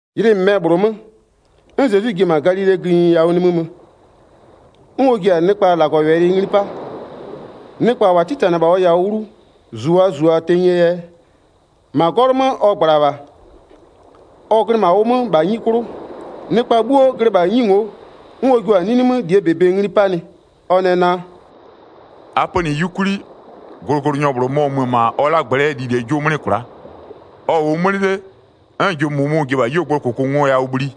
Ylɩ -mɩmɛ -bhlʋ 'mö, 'n Zezwi ji-e -ma Galilee gïnyi yawʋ nimï mö, 'n ɔ ji-a nɩkpa -Lagɔwɛlɩ ngli 'pa. Nɩkpa -wa 'titanɩ-ɛ -bha ɔ yawʋ 'wlu -zu -wa -zu-a tenyie yɛ, -ma 'gɔlʋ 'mö ɔ -gbla -bha. Ɔ glɩ -ma ʋ 'mö -bha 'nyi 'klʋ, nɩkpa 'bhuo glɩ -bha 'nyi ngo'o. 'N ɔ jua-a 'nini 'mö -lie -bɛ ngli 'panɩ, ɔ nɛ naa: “A pönɩ 'yukwli, glʋglʋnyɔ -bhlʋ mɔ-ɔ mö-ö -ma ɔ 'lagblɛ'ɛ lilie 'jʋ 'mlɩ kwla'a. Ɔ -wʋʋ 'mlɩ 'le, 'n jʋ -mʋmʋ-ʋ ji-e -bha 'yuogblʋɔ -kʋkʋngoyawʋ bhli,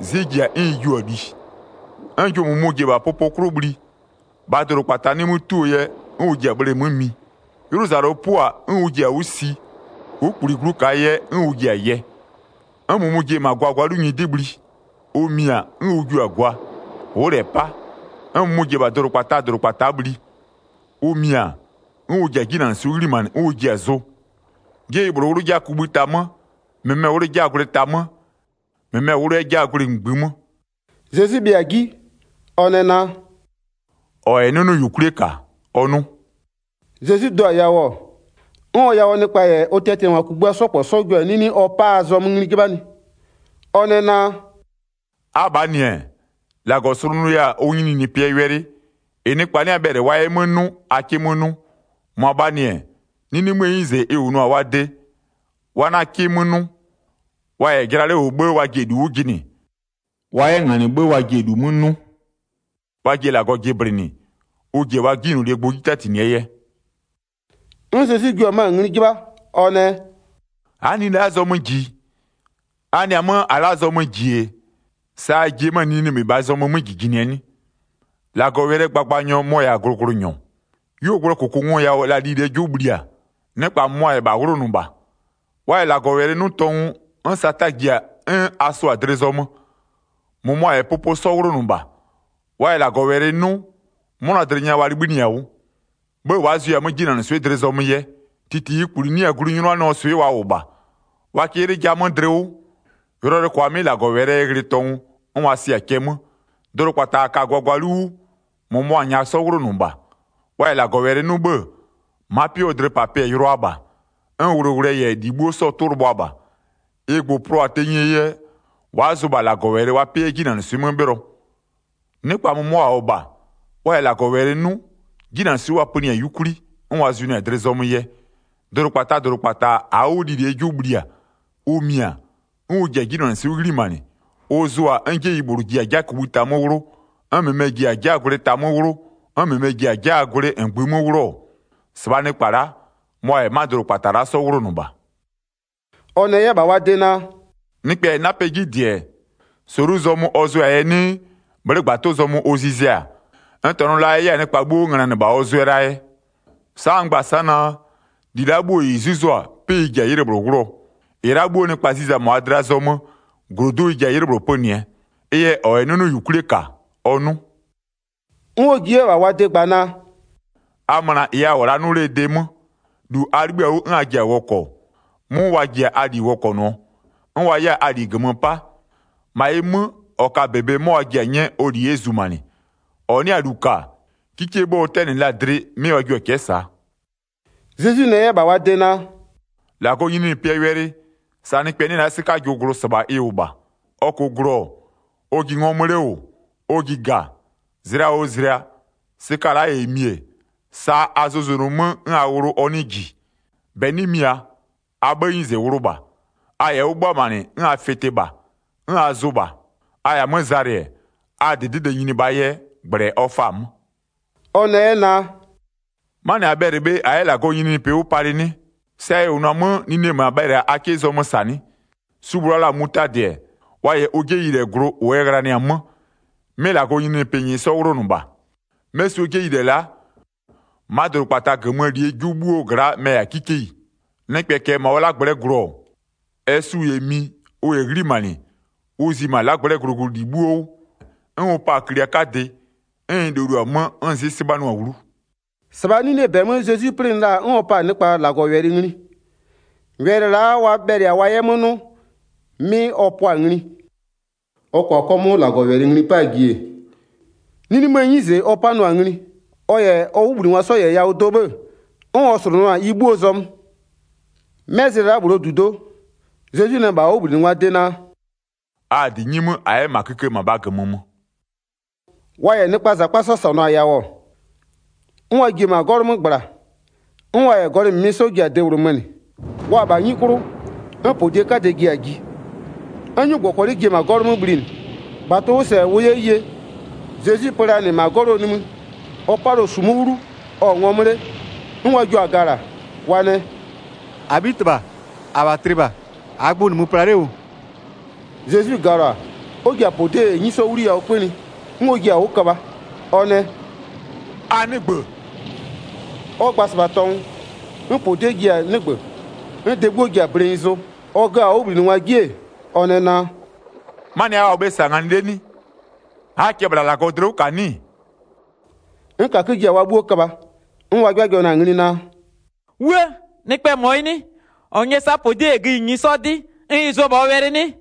'zɩ ji-a 'n ɩ jiʋ-a li. 'N jʋ -mʋmʋ-ʋ ji-e -bha pʋpʋ 'klʋ bhli, -bhaa dʋdʋkpata 'nɩ 'mö 'tuo yɛ, 'n ʋ ji-a bhleemö mi. 'Ylʋzalʋ 'pʋ-a, 'n ʋ ji-a 'wʋ si, ʋ'ʋ -kpuli glu -kaa yɛ, 'n ʋ ji-a yɛ. 'N -mʋmʋ-ʋ ji-e -ma gwagwalu nyɩdɩ bhli. Ʋ mi-a, 'n ʋ jiʋ-a gwa. Ʋ'ʋ -lɛ 'pa. 'N -mʋmʋ-ʋ ji-e -bha dʋdʋkpataa -dʋdʋkpata'a bhli. Ʋ mi-a, 'n ʋ ji-a 'jinanɩswɩ'ɩ 'ghlimanɩ 'n ʋ ji-a zʋ. 'Jeyi -bhlʋ 'wlʋ 'jaa kugbïta 'mö, -mɩmɛ 'wlʋ 'jaa gwlɩ ta 'mö, -mɩmɛ 'wlʋ 'yɛ 'jaa gwlɩ -ngbï 'mö.” Zezwi bhɩa-a 'ji, ɔ nɛ naa: “-Ɔ -yɛ 'nʋnʋyukwlie -ka, ɔ 'nʋ.” Zezwi do-a yawʋ-ɔ, 'n ɔ yawʋɔ nɩkpa -yɛ ɔ tiatiangwa kugbïa 'sɔ -kpɔ 'sɔ jio-a 'nini ɔ pa-aa zɔmö ngli 'jɩbhanɩ. Ɔ nɛ naa: “Abhaa -nɩ-ɛ, -Lagɔ slʋnʋya-a ʋ nyininyinipɩɛ wɛlɩ, -ɩ nɩkpa 'nɩ-a bhɛlɩ wa 'yɛ 'mö 'nʋ, a 'kɩ 'mö 'nʋ. -Mʋabhaa -nɩ-ɛ, 'nini 'möö 'nyize ɩ -wʋnʋ-a wa de, wa 'na 'kɩ 'mö 'nʋ. Wa -yɛ jɩla 'le -wʋ 'bhë wa ji-e -lu 'wʋ jɩnɩ. Wa 'yɛ -nganɩ 'bhë wa ji-e -lu 'mö 'nʋ. Wa ji-e -Lagɔ jɩblɩnɩ, ʋ ji-e wa 'jinylolie gbʋ 'ji 'tatinɩɛ yɛ.” 'N Zezwi jua 'mö-a ngli 'jɩbha, ɔ nɛ: “A'a nine la'aa zɔmö -ji-i? A nɩ-a 'mö -a la'aa zɔmö -ji-e, sa a ji-e 'mö-a nini -mɩbhaa zɔmö 'mö -jijinɩɛ 'nɩ? 14-Lagɔwɛlɩɛ gbagbanyɔ mɔ-ɔ -yɛ-a glʋglʋnyɔ. 'Yuogblʋɔ -kʋkʋngoyawʋ la lilie 'jʋ bhli-a, nɩkpa -mʋmʋa -yɛ -bha 'wlʋnʋ -bha. Wa -yɛ -Lagɔwɛlɩ 'nʋ tɔngʋ, 'n Sata ji-a, 'n a sʋa-a dlɩ zɔmö. 16-Mʋmʋa -yɛ pʋpʋ 'sɔ 'wlʋnʋ -bha. Wa -yɛ -Lagɔwɛlɩ 'nʋ, 'mʋnadlɩ nya wa libhïnɩɩ-a 'wʋ. 'Bhë wa'a zʋɩ-a 'mö 'jinanɩswɩ'ɩ -ma dlɩ zɔmö yɛ. -Titi -ɩɩ -kpuli 'nɩ-a glu 'nyʋnanɩɔɔ swɩ'ɩ wa -wʋ -bha. Wa kɩ 'ylɩ ja 'mö dlɩ 'wʋ, yʋlɔyʋlʋɛ -kʋa 'mɩ -Lagɔwɛlɩɛ yɛ ghlɩ tɔngʋ, 'n wa sɩ-a cɛ 'mö. Dʋdʋkpata -a ka-a gwagwalu 'wʋ, -mʋmʋa -nyaa 'sɔ 'wlʋnʋ -bha. Wa -yɛ -Lagɔwɛlɩ 'nʋ 'bhë-ë, ma'a 'pɩ 'wʋɔ dlɩpapɩɛ yʋlʋaa -bha, 'n wʋlʋwʋlʋɛ -yɛ -li 'bhuo 'sɔɔ 'tʋ lɩbhʋa -bha. Ɩ gbʋ-ʋ plʋa-a tenyie yɛ, wa'a zʋ -bha -Lagɔwɛlɩ wa 'pɩ yɛ 'jinanɩswɩ'ɩ 'mö 'bhɩlɔ. Nɩkpa -mʋmʋa -wʋ-ɔ -bha, wa -yɛ -Lagɔwɛlɩ 'nʋ, 'jinanɩswɩ'ɩ wa pönɩɩ-a 'yukwli, 'n wa zʋnʋɩ-a dlɩ zɔmö yɛ. Dʋdʋkpataa -dʋdʋkpata -aa 'wʋ lilie 'jʋ bhli-a, ʋ mi-a, 'n ʋ ji-a 'jinanɩswɩ'ɩ 'ghlimanɩ, ʋ zʋ-a, 'n 'jeyi -bhlʋ ji-a 'jaa kugbïta 'mö 'wlʋ, 'n -mɩmɛ ji-a 'jaa gwlɩ ta 'mö 'wlʋ, 'n -mɩmɛ ji-a 'jaa gwlɩ -ngbï 'mö 'wlʋ-ɔ, -sɩbhaa nɩkpa la'a mʋa -yɛ 'ma dʋdʋkpata la'a 'sɔ 'wlʋnʋ -bha.” Ɔ nɛ 'yɛ -bha wa de naa: “Nɩkpɛ -yɛ 'napɛ 'ji -dɩ-ɛ, -solu zɔmö ɔ zʋɛ-a yɛ 'nɩɩ, bhlɩ'ɩ -gbatʋ zɔmö ɔ zizɛ-a? N -tɔnʋ la ɛ 'yɛ-a nɩkpa 'bhuo 'wʋ ngönanɩ -bha ɔ zʋɛ la yɛ? Sa'a n gba-a sa'a naa, -ɩ la'a 'bhuo -ɩ 'zuzo-a, 'pɩ ɩ ji-a 'ylɩ -bhlʋ 'wlʋɔ. -Ɩ la'a 'bhuo nɩkpa ziza-a -ma wa dlɩa zɔmö, -glodu'u ɩ ji-a 'ylɩ -bhlʋ pönɩɛ. Ɩ yɛ -ɔ -yɛ 'nʋnʋyukwlie -ka, ɔ 'nʋ.” 'N ɔ ji 'yɛ-a -bha wa de gba naa: “A möna -ɩ a -wʋ-ɔ la'a 'nʋ 'lee de 'mö. -Wʋʋ yɛ-a, -lu a 'libhï-a 'wʋ 'n a ji-a wɔkɔ, 'mʋ wa ji-a a -li wɔkɔnʋɔ, 'n wa 'yɛ-a a -li -gömö 'pa. 25-Ma ɩ 'mö, -ɔ ka-a -bebe 'mɔ wa ji-a 'nyɛɛ ɔ -li 'yɛ zumanɩ. -Ɔ 'nɩ-a -lu -ka, 'kikie 'bhë ɔ 'tɛnɩ la-a dlɩ, 'mɩ wa jio-a cɛ'ɛ -saa.” Zezwi nɛ 'yɛ -bha wa de naa: “-Lagɔɔ nyininyinipɩɛ wɛlɩ, sa nɩkpɛ 'nɩ-ɛ la'a 'sɩkajʋ glʋ -sɩbha ɩ -wʋ -bha. Ɔ -kʋʋ glʋ-ɔ, ɔ ji ngɔmö 'le -wʋ, ɔ ji -ga, zlɩa oo zlɩa, sɩka la'a -yɛ mi-e, sa a zʋzʋnʋ 'mö 'n a wlʋ ɔ 'nɩɩ -ji. 28-Bɛ 'nɩ mia, a 'bhëë 'nyize wlʋ -bha. A -yɛ 'wʋ 'bhʋamanɩ, 'n a fɩtɩ -bha, 'n a zʋ -bha. A -yɛ-a 'mö zalɩ-ɛ, a -dɩdɩde nyini -bhaa yɛ, -gblɛ ɔ faa-a 'mö.” Ɔ nɛ 'yɛ naa: “'Manɩ -a bhɛlɩ-a -a 'yɛ -Lagɔɔ nyininyinipɩ 'wʋ palɩ 'nɩ? Sa ɛ -wʋnʋ-a 'mö, nine -ma bhɛlɩ-a a 'kɩ zɔmö -sa 'nɩ? Su -bhlʋ wa la-a mutadɩ, wa -yɛ ʋ 'jeyilɛ glʋ, -ʋ ɛ ghlanɩ-a 'mö, 'mɩ -Lagɔɔ nyininyinipɩ -nyɩɩ 'sɔ 'wlʋnʋ -bha. 'Mɛ suo 'jeyilɛ la'a, ma'a dʋdʋkpata -gömöö -lie 'jʋ 'bhuo gla'a mɛ-ɛ -yɛ-a 'kikeyi. Nɩkpɛ -kɛɛ -ma ɔ 'lagblɛ'ɛ glʋ-ɔ, ɛ su -yɛ mi, ʋ -yɛ 'ghlimanɩ, ʋ zi -ma 'lagblɛ'ɛɛ glʋglʋli 'bhuo 'wʋ. 'N ʋ pa-a klia 'kadɩ, 'n ɩ loluo-a 'mö, 'n 'zɩ 'sɩbhanʋ-a 'wlu.” 33-Sɩbhaa 'ninie -bɛ 'mö Zezwi 'plɩnɩ la-a, 'n ɔ pa-a nɩkpa -Lagɔwɛlɩ ngli. Wɛlɩ la'a wa bhɛlɩ-a wa 'yɛ 'mö 'nʋ, 'mɩ ɔ pʋa-a ngli. Ɔ -kʋa 'kɔmʋʋ -Lagɔwɛlɩ ngli 'paa ji-e, 'ninie 'nyize 'mö ɔ 'panʋa-a ngli. Ɔ -yɛ ɔ 'wʋbhlinɩngwa 'sɔ -yɛ yawʋ do 'bhë, 'n ɔ slʋnʋʋa-a ɩ 'bhuoo zɔmö. 'Mɛ zlɩ la'a -bhlʋɔ -dudo'o, Zezwi nɛ -bha ɔ 'wʋbhlinɩngwaa de naa: “A-a -dɩ 'nyi 'mö, -a 'yɛ -ma kïkë -mabhaa -gömö mö.” Wa -yɛ nɩkpaa -zakpa 'sɔ -sɔnʋ-a yawʋ, 'n wa ji-e -ma 'gɔlʋ 'mö -gbla, 'n wa -yɛ gɔlɩ -mɩmɩ 'sɔ ji-a de -bhlʋ mönɩ. Wa-a -bha 'nyi 'klʋ, 'n -podie 'kadɛ ji-a ji, 'n 'nyugbɔkɔlɩ ji-e -ma 'gɔlʋ 'mö bhlinɩ, -bha tʋ-ʋ 'wʋ -sɛ ʋ 'yɛ ye. Zezwi pö la -nɩ -ma 'gɔlʋɔ nimï, ɔ 'palɩɔ -sumu 'wlu, ɔ-ɔ ngɔmö 'le. 'N wa jio-a gala, wa nɛ: “-Abhitɩbha! -Abha tlɩ -bha! -Aa gbʋ -nɩmö pla 'le -wʋ-ʋ?” Zezwi galɔ-a, 'n ɔ ji-a -podie -yɛ 'nyi 'sɔ 'wliyawʋ 'kpönɩ, 'n ɔ jiɩ-a 'wʋ köbha, ɔ nɛ: “A 'nɩgbö!” Ɔ gba-a -sɩbha tɔngʋ, 'n -podie ji-a 'nɩgbö, 'n de 'bhuo ji-a blenyi zʋ. Ɔ gö-a ɔ 'wʋbhlinɩngwa 'ji-e, ɔ nɛ naa: “'Manɩɛ yɛ a -wʋ bhe -sa nganɩ 'le nɩ? A'aa cɛ -bhla -Lagɔ dlɩ 'wʋ -ka 'nɩ-ɩ?” 'N -kakö ji-a wa 'bhuo köbha, 'n wa 'jɩbhajɩbhanɩ-a ngli naa: “'Wuë! Nɩkpɛɛ -mɔ yɩ 'nɩ? -Ɔ nyɛ-ɛ -sa -podie -yɛ gïnyi 'sɔ 'dɩ, 'n ɩ zʋ-ɔ -bha ɔ wɛlɩ 'nɩ?”